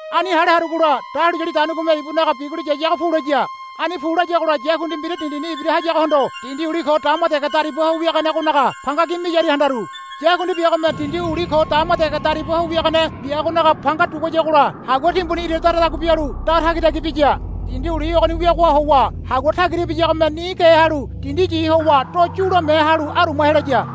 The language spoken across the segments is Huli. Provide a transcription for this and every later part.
Ani hale harugola dahuliyali daunigome ibunaga biguli yayago pulaya. Ani pu layagola yakundi mbira dindini ibira hayagohondo dindi uli ko dama dege dariba ho wiaganegonaga panga gi miyaria handaru. Yakundi biagome dindi uli ko dama dege dariba ho wiagane biagonaga panga duguayagola hagua timbuni ira daradagua bialu da tagitagi biya. Dindi uli ogoni wiagoha howa hagua tagira ibiyagome ni ge halu dindi yi howa do yulame halu aruma helaya.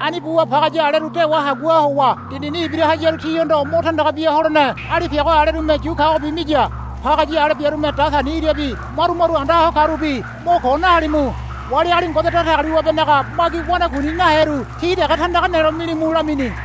Ani buwa pagaya aleru dewa haguaha howa dindini ibira hayaru tihondo mo tandaga bia holene alipiago alerume yu kagobi miya. Pagaya ale biarume datani irabi maru maru anda ho karubi, Mo ko nahalimu. Wali agali Ngode Datagaliwabenaga magi wanakuini naheru ti dege tandaga nelo milimu, lamini.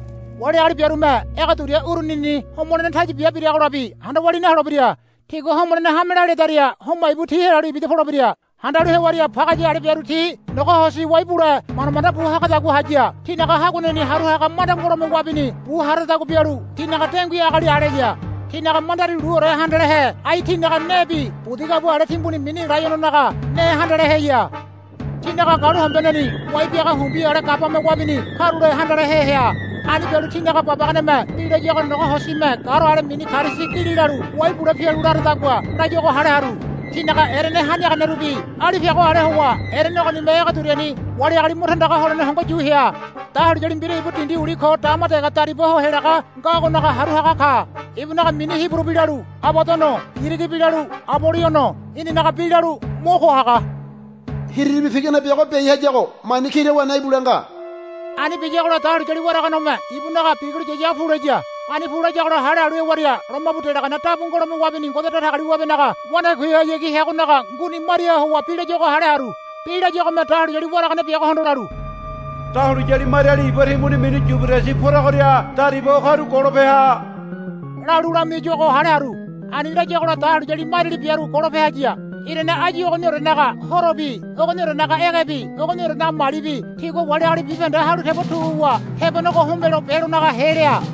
Wali agali biarume ege duria urunini homolene taya bia biragolabi handa walia naholebira. Tigua homolene hamela ledaria homa ibu ti helalu ibida polebira. Handalu hewaria pagaya ale biaru ti nogo hosi wai bule manda manda bu hagadagua haya. Tinaga haguaneni haru haga manda ngolome wabini bu haradagua bialu tinaga dengui agali aleya. Tinaga mandari luore handalehe ai tinaga nebi budi gabua ale timbuni mini laiononaga ne handaleheya. Tinaga galuhombeneni wai biaga humbi ale gabame wabini karule handalehe hea. Ani bialu tinaga babaganeme bi layuago nogo hosime garo ale mini karisi gili lalu wai bule pialu laradagua layuago hale haru. Tinaga erene haniaganerubi alipiago ale howa erene ogonime ege duriani wali agali mo tandaga holene hongo yu hea. Dahuliyali mbira ibu dindi uli ko dama dege dariba ho helaga ngagonaga haru haga ka. Ibunaga mini Hiburu bi lalu, Abadono, Girigi bi lalu, Aboliono, inanaga bi lalu Mo Ko Haga. Hiriribi pigane biago biai hayago mani kira wene ibule nga. Ani biyagola dahuliyali waraganegome ibunaga biguli yayago pulaya. Ani pu layagola hale halu hewaria lomabu delagane dabu ngolome wabini Ngode Datagaliwabenaga wanakuihayagi heagonaga nguni mariaha howa bi layuago hale haru. Bi layuagome dahuliyali waragane biagohondo lalu, Dahuliyali mariali iba timbuni mini Yuberedisi poragoria dariba ho karu golope ha, lalu lamiayuago hale haru. Ani layagola dahuliyali mariali biaru golope haya. Irane áyu ogoniorenaga horobi ogoniorenaga egebi ogoniorenaga malibi tigua wali agali bibahende halu tebo tu wuwa tebonego homelo belonagahe lea.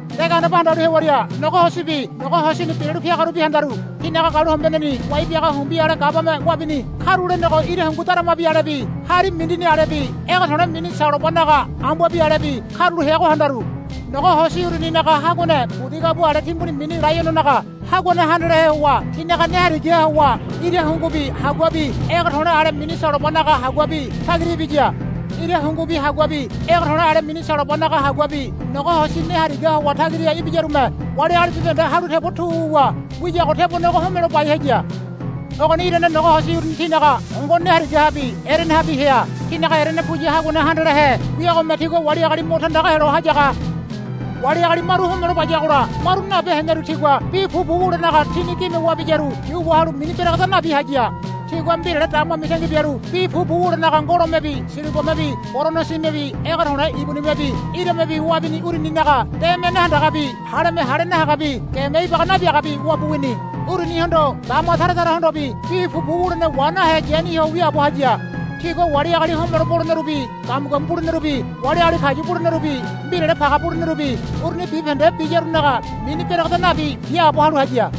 De gandeba handalu hewaria nogo hosibi nogo hosini biralu piagarubi handaru. Tinaga galuhombeneni wai biaga humbi ale gabame wabini karulenego ira hungu daramabi alebi hari mindini alebi ege to̱le̱ ale mini salobanaga ambuabi alebi karulo heago handaru. Nogo hosi uruninaga haguane budi gabua ale timbuni mini laiononaga haguane handalehe howa tinaga ne harigaha howa ira hungubi haguabi ege to̱le̱ ale mini salobanaga haguabi tagira ibiya. Ira hungubi haguabi ege to̱le̱ ale mini salobanaga haguabi nogo hosi ne harigaha howa tagira ibiyarume wali agali bibahende halu tebo tu wu wiyago tebonego homelo bai haya. Ogoni irane nogo hosi uruni tinaga hongo ne harigahabi erenehabi hea. Tinaga erene puya haguane handalehe wiagome tigua wali agali mo tandaga helo hayaga. Wali agali maru homelo bayagola maru nabe heneru tigua bi pupu wulenaga tini gime wabiyaru yu wahalu mini beregeda nabi haya. Tigua mbirale dama mitangi bialu bi pupu wulenaga ngolomebi silibamebi boronosimebi ege to̱le̱ ibunimebi iramebi wabini uruninaga deme nahandagabi haleme hale nahagabi geme ibaga nabiagabi wabu wini. Urunihondo dama tara tarahondobi bi pupu wulene wa nahe yani ho wiaabo haya. Tigua wali agali homelo bolenerubi gamu gamu bulenerubi wali agali kayu bulenerubi mbirale page bulenerubi uruni bibahende biyarunaga mini beregeda nabi biaabo halu haya.